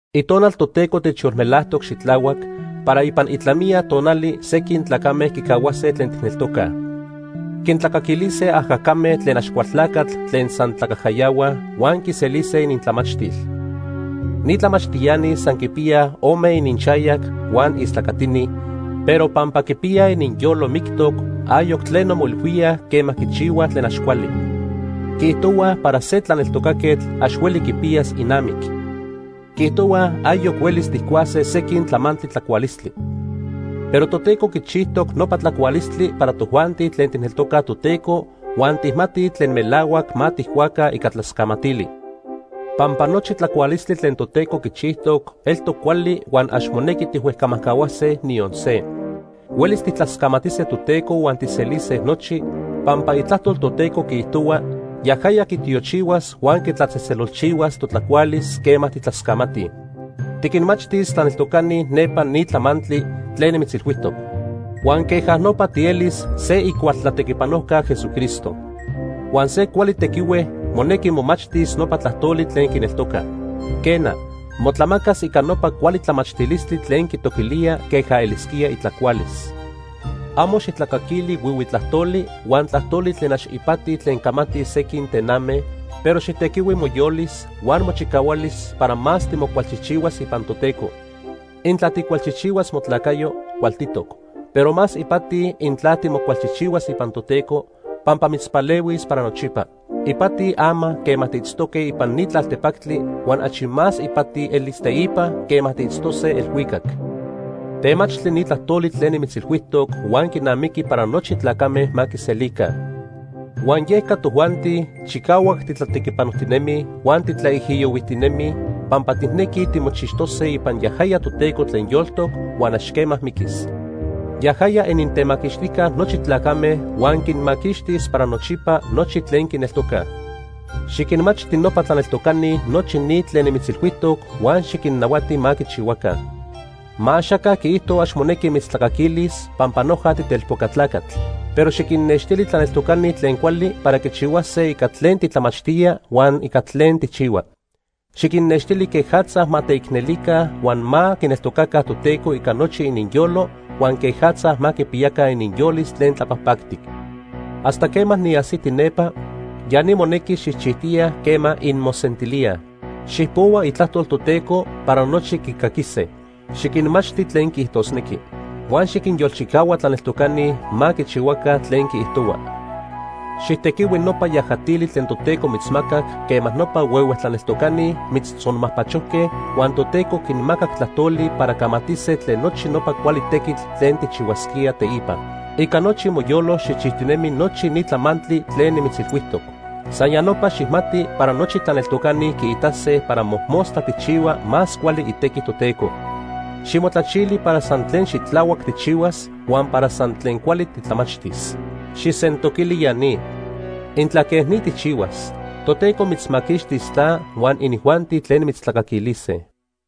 Itonal Toteco techyolmelajtoc xitlahuac para ipan itlamiya tonali sequin tlacame quicahuase tlen tijneltocaj. Quintlacaquilise ajacame tlen Axcualtlacatl tlen san tlacajcayahuaj huan quiselise inintlamachtil. Ni tlamachtiani san quipiyaj ome ininxayac huan istlacatini, pero pampa quipiyaj ininyolo mictoc, ayoc tleno moilhuíaj quema quichihuaj tlen ax cuali. Quiijtohuaj para se tlaneltocaquetl ax hueli quipiyas inamic. Quiijtohuaj ayoc huelis tijcuase sequin tlamantli tlacualistli. Pero Toteco quichijtoc nopa tlacualistli para tojuanti tlen tijneltocaj Toteco huan tijmatij tlen melahuac ma tijcuaca ica tlascamatili. Pampa nochi tlacualistli tlen Toteco quichijtoc eltoc cuali huan ax monequi tijhuejcamajcahuase niyon se. Huelis tijtlascamatise Toteco huan tijselise nochi, pampa Itlajtol Toteco quiijtohua yajaya quitiochihuas huan quitlatzejtzelolchihuas totlacualis quema tijtlascamatij. Xiquinmachtis tlaneltocani nepa ni tlamantli tlen nimitzilhuijtoc, huan queja nopa tielis se icual tlatequipanojca Jesucristo. Huan se cuali tequihue monequi momachtis nopa tlajtoli tlen quineltoca. Quena, motlamacas ica nopa cuali tlamachtilistli tlen quitoquilía queja elisquía itlacualis. Amo xijtlacaquili huihui tlajtoli huan tlajtoli tlen ax ipati tlen camatij sequin tename, pero xijtequihui moyolis huan mochicahualis para más timocualchijchihuas ipan Toteco. Intla tijcualchijchihuas motlacayo, cualtitoc. Pero más ipati intla timocualchijchihuas ipan Toteco, pampa mitzpalehuis para nochipa. Ipati ama quema tiitztoque ipan ni tlaltepactli huan achi más ipati elis teipa quema tiitztose elhuicac. Temachtli ni tlajtoli tlen nimitzilhuijtoc huan quinamiqui para nochi tlacame ma quiselica. Huan yeca tojuanti chicahuac titlatequipanojtinemij huan titlaijiyohuijtinemij pampa tijnequij timochixtose ipan yajaya Toteco tlen yoltoc huan ax quema miquis. Yajaya inintemaquixtijca nochi tlacame huan quinmaquixtis para nochipa nochi tlen quineltocaj. Xiquinmachti nopa tlaneltocani nochi ni tlen nimitzilhuijtoc huan xiquinnahuati ma quichihuaca. Ma axaca quiijto ax monequi mitztlacaquilis pampa noja titelpoca tlacatl. Pero xiquinnextili tlaneltocani tlen cuali para quichihuase ica tlen titlamachtía huan ica tlen tijchihua. Xiquinnextili quejatza ma teicnelica huan ma quineltocaca Toteco ica nochi ininyolo huan quejatza ma quipiyaca ininyolis tlen tlapajpactic. Hasta quema niajsiti nepa, ya ni monequi xijchijtiya quema inmosentilíaj. Xijpohua Itlajtol Toteco para nochi quicaquise. Xiquinmachti tlen quiijtosnequi. Huan xiquinyolchicahua tlaneltocani ma quichihuaca tlen quiijtohua. Xijtequihui nopa yajatili tlen Toteco mitzmacac quema nopa huehue tlaneltocani mitztzonmajpachojque huan Toteco quinmacac tlajtoli para camatise tlen nochi nopa cuali tequitl tlen tijchihuasquía teipa. Ica nochi moyolo xijchijtinemi nochi ni tlamantli tlen nimitzilhuijtoc. San ya nopa xijmati para nochi tlaneltocani quiitase para mojmostla tijchihua más cuali itequi Toteco. Ximotlachili para san tlen xitlahuac tijchihuas huan para san tlen cuali titlamachtis. Xijsentoquili ya ni. Intla quej ni tijchihuas, Toteco mitzmaquixtis ta huan inijuanti tlen mitztlacaquilise.